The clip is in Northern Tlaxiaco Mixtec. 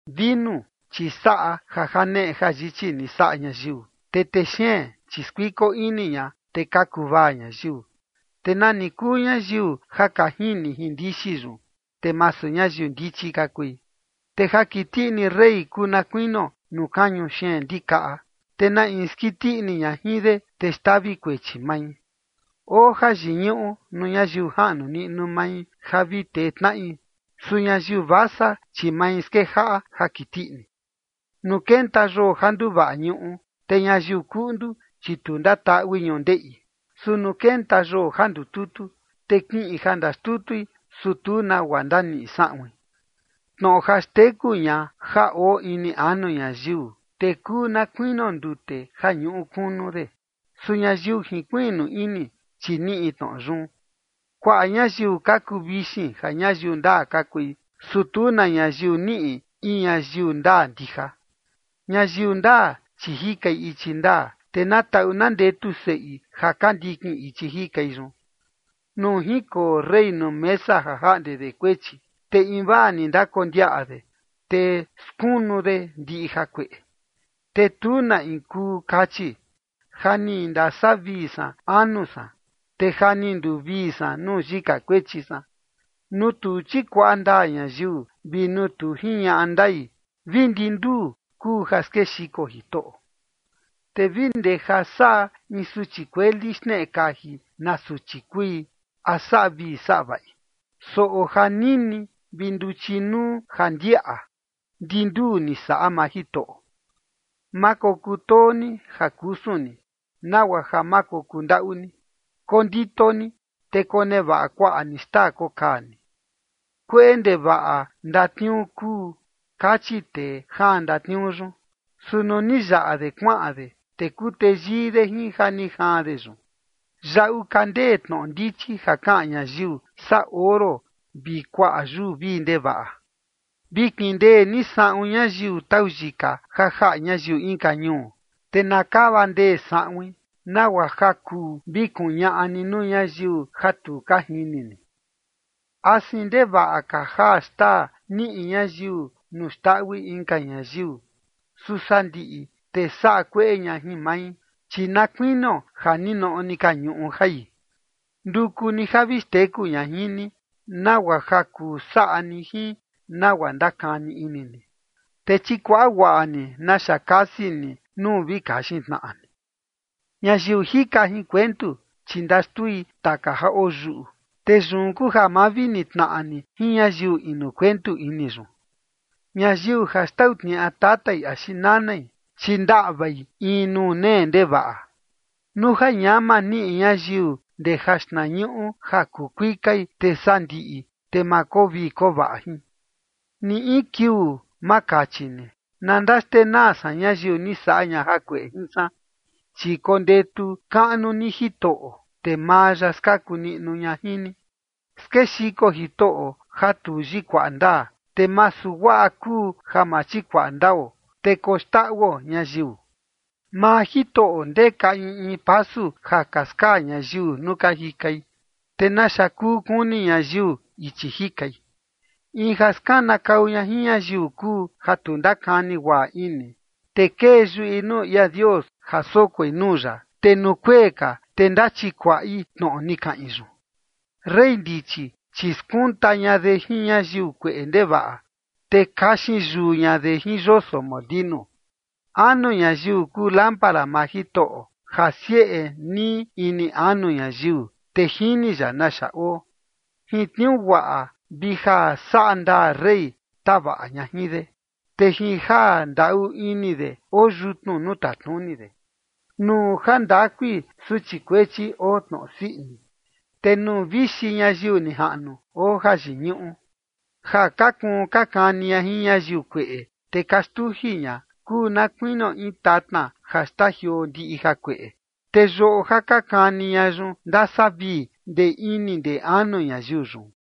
Vinu, chi saꞌa ja janeꞌe jayichi ni saꞌa ñayiu, te texeen, chi skuiko ini ña, te ka kuvaa ñayiu, te nani kuu ñayiu ja ka jini jin ndixi yun, te masu ñayiu ndichi ka kui. Te ja kiti ini rey kuu na kuinio nuu kañu xeen ndikaꞌa, te na in skiti ini ña jin de, te xtavi kuechi mai. Oo jayiñuꞌu nuu ñayiu jaꞌnu niꞌnu mai ja vi tee tnaꞌi. Su ñayiu vasa, chi mai skejaꞌa ja kiti ini. Nuu kenta yoo ja nduvaꞌa ñuꞌu, te ñayiu kuꞌndu, chi tu ndataꞌui ñundeꞌi. Su nuu kenta yoo ja ndututu, te kiꞌin ja ndaxtutui, su tu nagua ndaniꞌi saꞌuin. Tnoꞌo ja xteku ña ja oo ini anu ñayiu, te kuu na kuinio ndute ja ñuꞌu kunu de. Su ñayiu jinkuiꞌnu ini, chi niꞌi tnoꞌo yun. Kuaꞌa ñayiu ka kuu vixin ja ñayiu ndaa ka kui. Su tu na ñayiu niꞌi in ñayiu ndaa ndija. Ñayiu ndaa, chi jikai ichi ndaa, te na taꞌu na ndetu seꞌi ja ka ndikin ichi jikai yun. Nuu jinkoo rey nuu mesa ja jaꞌnde de kuechi, te invaa ni ndakondiaꞌa de, te skunu de ndiꞌi jakueꞌe. Te tu na in kuu kachi: “Ja ni ndasavii san anu san, te ja ni nduvii san nuu yika kuechi san”. Nuu tu chikuaꞌa ndaa ñayiu vi nuu tu jiñaꞌa ndai, vi ndi nduu kuu ja skexiko Jitoꞌo. Te vi ndee ja saꞌa in suchi kueli xneꞌe kaji na suchi kui, a saꞌa vii saꞌa vaꞌi. Soꞌo ja nini vi nduchi nuu ja ndiaꞌa, ndi nduu ni saꞌa maa Jitoꞌo. Ma kokutoo ni ja kusun ni, nagua ja ma kokuu ndaꞌu ni, kondito ni, te konevaꞌa kuaꞌa ni xtaa kokaa ni. “Kueꞌe ndevaꞌa ndatniuu kuu”, kachi tee jaan ndatniuu yun. Su nuu ni yaꞌa de kuaꞌan de, te kuu teyii de jin ja ni jaan de yun. Yaꞌu ka ndee tnoꞌo ndichi ja kaꞌan ñayiu, saa oro vi kuaꞌa yuu vii ndevaꞌa. Vi kindee ni saꞌun ñayiu tau yika ja jaꞌa ñayiu inka ñuu, te na kava ndee saꞌuin, nagua ja kuu vi kuñaꞌa ni nuu ñayiu ja tu ka jini ni. Asin ndevaꞌa ka jaa xtaa niꞌi ñayiu nuu xndaꞌui inka ñayiu. Su sandiꞌi, te saꞌa kueꞌe ña jin mai, chi na kuinio ja ninoꞌo ni ka ñuꞌu jai. Nduku ni ja vi xteku ña jin ni, nagua ja kuu saꞌa ni jin nagua ndakani ini ni, te chikuaꞌa guaꞌa ni naxa kasi ni nuu vi kaxin tnaꞌa ni. Ñayiu jika jin kuentu, chi ndaxtui taka ja oyuꞌu, te yun kuu ja ma vi nitnaꞌa ni jin ñayiu inu kuentu ini yun. Ñayiu ja xtau tniaꞌa tatai axi nanai, chi ndaꞌvai in nuu nee ndevaꞌa. Nuu ja ñama niꞌi ñayiu ndee jaxtnañuꞌu ja kuu kuikai, te sandiꞌi, te ma koo vii koo vaꞌa jin. Ni in kiuu ma kachi ni: “Na ndaxtenaa san ñayiu ni saꞌa ña jakueꞌe jin san”, chi kondetu kaꞌnu ni Jitoꞌo, te maa ya skaku niꞌnu ña jin ni. Skexiko Jitoꞌo ja tu yikuaꞌa ndaa, te masu guaꞌa kuu ja ma chikuaꞌa ndao, te koxndaꞌuo ñayiu. Maa Jitoꞌo ndeka in in pasu ja ka skaa ñayiu nuu ka jikai, ¿te naxa kuu kuni ñayiu ichi jikai? In ja skanakau ña jin ñayiu kuu ja tu ndakani guaꞌa ini, te kee yuꞌi nuu ia Dios ja sokoi nuu ya, te nuu kuee ka, te ndachikuaꞌi tnoꞌo ni kaꞌin yun. Rey ndichi, chi skunta ña de jin ñayiu kueꞌe ndevaꞌa, te kaxin yuu ña de jin yoso molinu. Anu ñayiu kuu lámpara maa Jitoꞌo ja sieꞌe nii ini anu ñayiu, te jini ya naxa oo. Jin tniuu guaꞌa vi ja saꞌa ndaa rey tavaꞌa ña jin de, te jin ja ndaꞌu ini de oo yutnu nuu tatnuni de. Nuu jandakui suchi kuechi oo tnoꞌo sii ini, te nuu vixi ñayiu nijaꞌnu oo jayiñuꞌu. Ja ka kuun ka kani ña jin ñayiu kueꞌe, te ka xtuji ña, kuu na kuinio in tatna ja xtajioo ndiꞌi jakueꞌe. Te yoꞌo ja ka kani ña yun ndasavii ndee ini ndee anu ñayiu yun.